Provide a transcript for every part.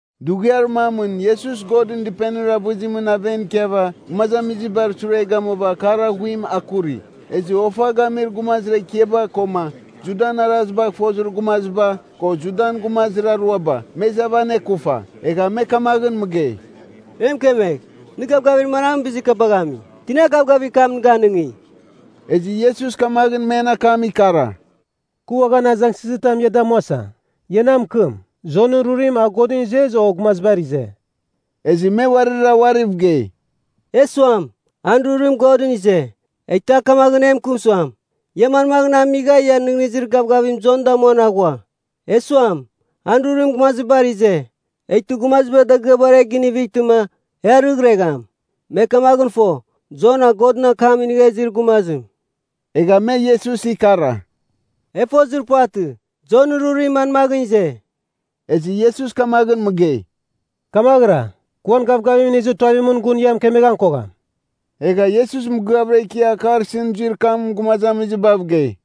Dughiar mamɨn Iesus Godɨn Dɨpenir avɨzimɨn aven ikiava, gumazamizibar sure gamuava akar aghuim akuri. Ezɨ ofa gamir gumazir ekiaba, koma Judan arazibagh fozir gumaziba, ko Judan gumazir aruaba, me izava anekufa. Egha me kamaghɨn mɨgei, “E mɨkemegh, nɨ gavgavir manamɨn bizir kabagh ami? Tina gavgavir kam nɨ ganɨngi?” Ezɨ Iesus kamaghɨn men akam ikara, “Kɨ uaghan azangsɨzitam ia damuasa. Ia na mɨkɨm, Jonɨn rurim, a Godɨn ize o gumazibar ize?” Ezɨ me uarira uariv gei, “E suam, ‘An rurim Godɨn ize,’ eghtɨ, a kamaghɨn mɨkɨm suam, ‘Ia manmaghɨn amigha ia nɨghnɨzir gavgavim Jon damuan aghua?’ E suam, ‘An rurim gumazibar ize,’ eghtɨ gumaziba dagɨabar e ginivightɨma, e arɨghregham. Me kamaghɨn fo Jon a Godɨn akam inigha izir gumazim.” Egha me Iesus ikara, “E fozir puvatɨ, Jonɨn rurim manmaghɨn ize.” Ezɨ Iesus kamaghɨn mɨgei, “Kamaghɨra, kɨ uan gavgavim inizir tuavimɨn, gun ia mɨkemeghan kogham.” Egha Iesus mɨgɨavɨra ikia akar isɨn zuir kam gumazamizibav gei,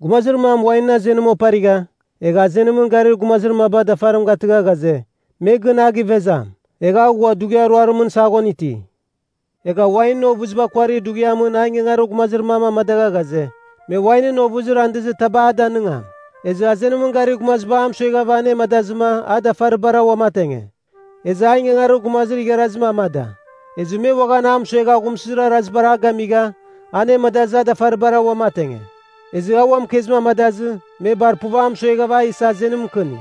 “Gumazir mam wainɨn azenim oparigha, egha azenimɨn garir gumazir mabar dafarim garɨgha ghaze, me gɨn a givezam. Egha a ghua dughiar ruarimɨn saghon iti. Egha wainɨn ovɨziba kuarir dughiamɨn a ingangarir gumazir mam amadagha ghaze, me wainɨn ovɨzir andɨzir taba a danɨngam. Ezɨ azenimɨn garir gumaziba a mɨsueghava anemadazɨma, a dafaribara uamatenge. Ezɨ a ingangarir gumazir igharazim amada, ezɨ me uaghan a mɨsuegha aghumsɨzir arazibar a gamigha, anemadazɨ a dafaribara uamatenge. Ezɨ a ua mɨkezim amadazɨ, me bar puv a mɨsuegha a isa azenim mɨkɨni.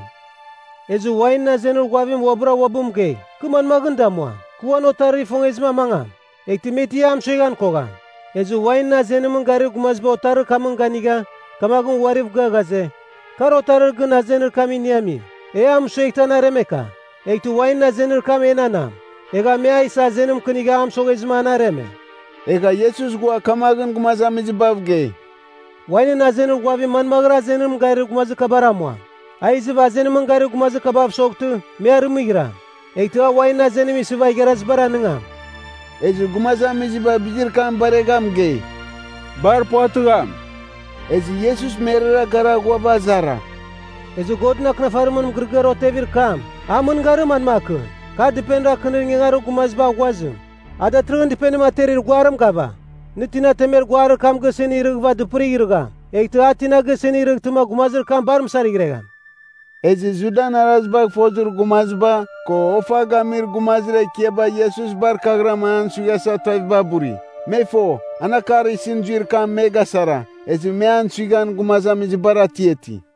“Ezɨ wainɨn azenir ghuavim uabɨra uabɨ mɨgei, ‘Kɨ manmaghɨn damuam? Kɨ uan otarir ifongezim amangam. Eghtɨ me ti a mɨsueghan kogham.’ Ezɨ wainɨn azenimɨn garir gumaziba otarir kamɨn ganigha, kamaghɨn uariv gɨa ghaze, ‘Kar otarir gɨn azenir kam iniamim. E a mɨsueghtɨ an aremeka. Eghtɨ wainɨn azenir kam enanam.’ Egha me a isa azenim mɨkɨnigha a mɨsoghezɨma an areme.” Egha Iesus ghua kamaghɨn gumazamizibav gei, “Wainɨn azenir ghuavim manmaghɨra azenimɨn garir gumazir kabar amuam? A izɨva azenimɨn garir gumazir kabav soghtɨ, me arɨmɨghiram. Eghtɨ a wainɨn azenim isɨva igharazibar anigam.” Ezɨ gumazamiziba bizir kam baregha mɨgei, “Bar puvatɨgham!” Ezɨ Iesus merara gara ghuava azara, “Ezɨ Godɨn Akɨnafarimɨn mɨgɨrɨgɨar otevir kam, an mɨngarim manmakɨn? ‘Kar dɨpenir akɨnir ingangarir gumaziba aghuazim, a datɨrɨghɨn dɨpenim aterir guarim gava?’ Nɨ tina temer guarir kam gisɨn irɨghɨva dɨpɨrigh irɨgham, eghtɨ a tina gisɨn irɨghtɨma gumazir kam bar mɨsarighregham.” Ezɨ Judan arazibagh fozir gumaziba, ko ofa gamir gumazir ekiaba Iesus bar kaghɨram an suighasa tuaviba buri. Me fo, an akar isɨn zuir kam me gasara, ezɨ me an suighan gumazamizibar atiati.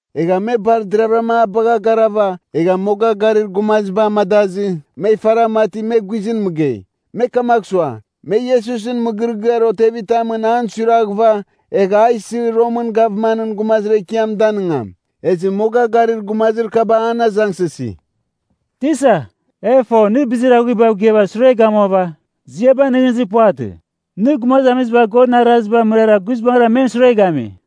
Egha me bar deravɨra a bagha garava, egha moga garir gumaziba amadazɨ, me ifara mati me guizɨn mɨgei. Me kamagh sua, me Iesusɨn mɨgɨrɨgɨar otevitamɨn an suiraghɨva, egh a isɨ Romɨn gavmanɨn gumazir ekiam danigam. Ezɨ moga garir gumazir kaba an azangsɨsi, “Tisa, e fo nɨ bizir aghuibav gɨava sure gamuava, ziabagh nɨghnɨzir puvatɨ. Nɨ gumazamiziba Godɨn arazibar mɨrara guizbangɨra men sure gami.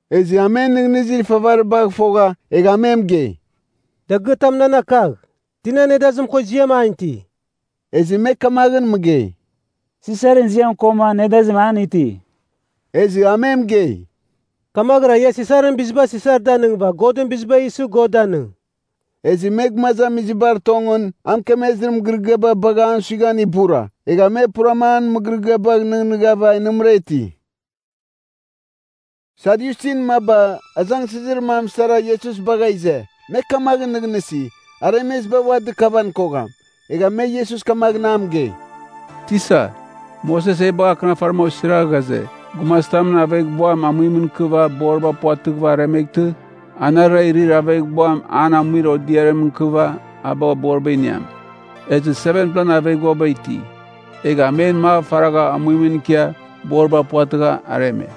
Ezɨ a men nɨghnɨzir ifavaribagh fogha, egha a me mɨgei, “Dagɨatam nan akagh. Tinan nedazim ko ziam an iti?” Ezɨ me kamaghɨn mɨgei, “Sisarɨn ziam koma nedazim an iti.” Ezɨ a me mɨgei, “Kamaghɨra ia Sisarɨn biziba Sisar danɨngɨva, Godɨn biziba isɨ, God danɨng.” Ezɨ me gumazamizibar tongɨn, a mɨkemezir mɨgɨrɨgɨaba bagha an suighan ibura. Egha me purama an mɨgɨrɨgɨabagh nɨghnɨghava nɨmɨra iti. Sadyusin maba azangsɨzir mam sara Iesus bagha ize. (Me kamaghɨn nɨghnɨsi, aremeziba ua dɨkavan kogham.) Egha me Iesus kamaghɨn a mɨgei, “Tisa, Moses e bagha akɨnafarim osira ghaze, gumazitamɨn aveghbuam amuimɨn ikɨva boriba puvatɨghɨva aremeghtɨ, anarɨra irir aveghbuam an amuir odiarimɨn ikɨva a bagh boriba iniam. Ezɨ 7-plan aveghbuaba iti. Egha men mav faragha amuimɨn ikia boriba puvatɨgha areme.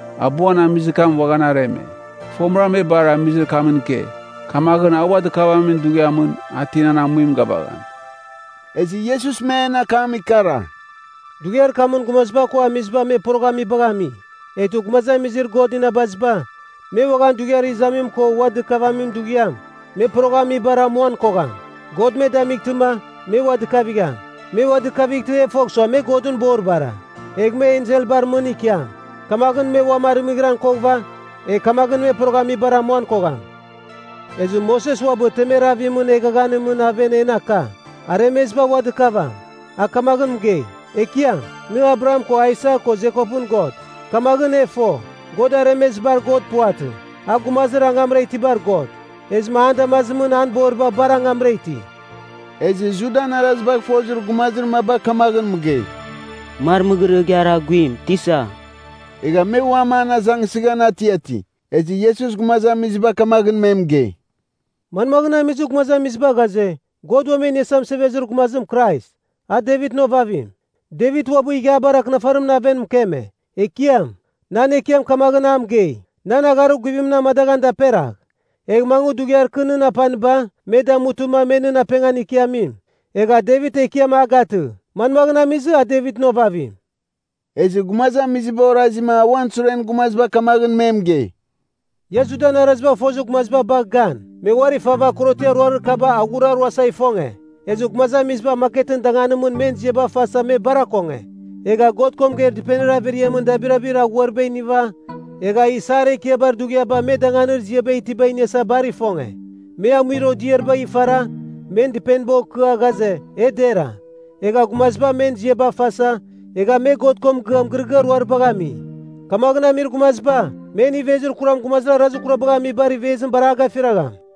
Abuan amizir kam uaghan areme. Fomɨra me bar amizir kamɨn ike. Kamaghɨn a ua dɨkavamin dughiamɨn, a tinan amuim gavagham?” Ezɨ Iesus men akam ikara, “Dughiar kamɨn gumaziba ko amiziba me poroghamibagh ami. Eghtɨ gumazamizir God inabaziba, me uaghan dughiar izamim ko ua dɨkavamin dughiam, me poroghamibar amuan kogham. God me damightɨma, me ua dɨkavigham. Me ua dɨkavightɨ e fogh suam me Godɨn boribara, egh me enselbar mɨn ikiam. Kamaghɨn me uam arɨmɨghɨran koghɨva, egh kamaghɨn me poroghamibar amuan kogham. Ezɨ Moses uabɨ temer avimɨn eghaghanimɨn aven en aka, aremeziba ua dɨkavam. A kamaghɨn mɨgei, ‘Ekiam, Nɨ Abraham ko Aisak ko Jekopɨn God.’ Kamaghɨn e fo, God aremezibar God puvatɨ, a gumazir angamra itibar God. Ezɨma an damazimɨn an boriba bar angamra iti.” Ezɨ Judan arazibagh fozir gumazir maba kamaghɨn mɨgei, “Mar mɨgɨrɨgɨar aghuim, Tisa.” Egha me uam an azangsɨghan atiati. Ezɨ Iesus gumazamiziba kamaghɨn me mɨgei, “Manmaghɨn amizɨ gumazamiziba ghaze, God Uam E Iniasa Mɨsevezir Gumazim Krais, a Devitɨn ovavim? Devit uabɨ Ighiabar Akɨnafarimɨn aven mɨkeme, ‘Ekiam, nan Ekiam kamaghɨn a mɨgei, “Nan agharir guvimɨn amadaghan daperagh. Egh mangɨ dughiar kɨ nɨn apaniba, me damutɨma me nɨn apengan ikiamim.” ’ Egha Devit ‘Ekiam’ a gatɨ. Manmaghɨn amizɨ, a Devitɨn ovavim?” Ezɨ gumazamiziba orazima a uan suren gumaziba kamaghɨn me mɨgei, “Ia Judan arazibagh fozir gumaziba bagh gan. Me uari fava korotiar ruarir kaba aghuraruasa ifonge. Ezɨ gumazamiziba maketɨn danganimɨn men ziaba fasa me bar akonge. Egha God ko mɨgeir dɨpenir averiamɨn dabirabir aghuariba iniva, egha isar ekiabar dughiabar me danganir ziaba itiba iniasa bar ifonge. Me amuir odiaribagh ifara, men dɨpeniba okɨa, ghaze e dera. Egha gumaziba men ziaba fasa, egha me God ko mɨgɨa mɨgɨrɨgɨar ruaribagh ami. Kamaghɨn amir gumaziba, men ivezir kuram gumazir arazir kurabagh amibar ivezim bar a gafiragham.”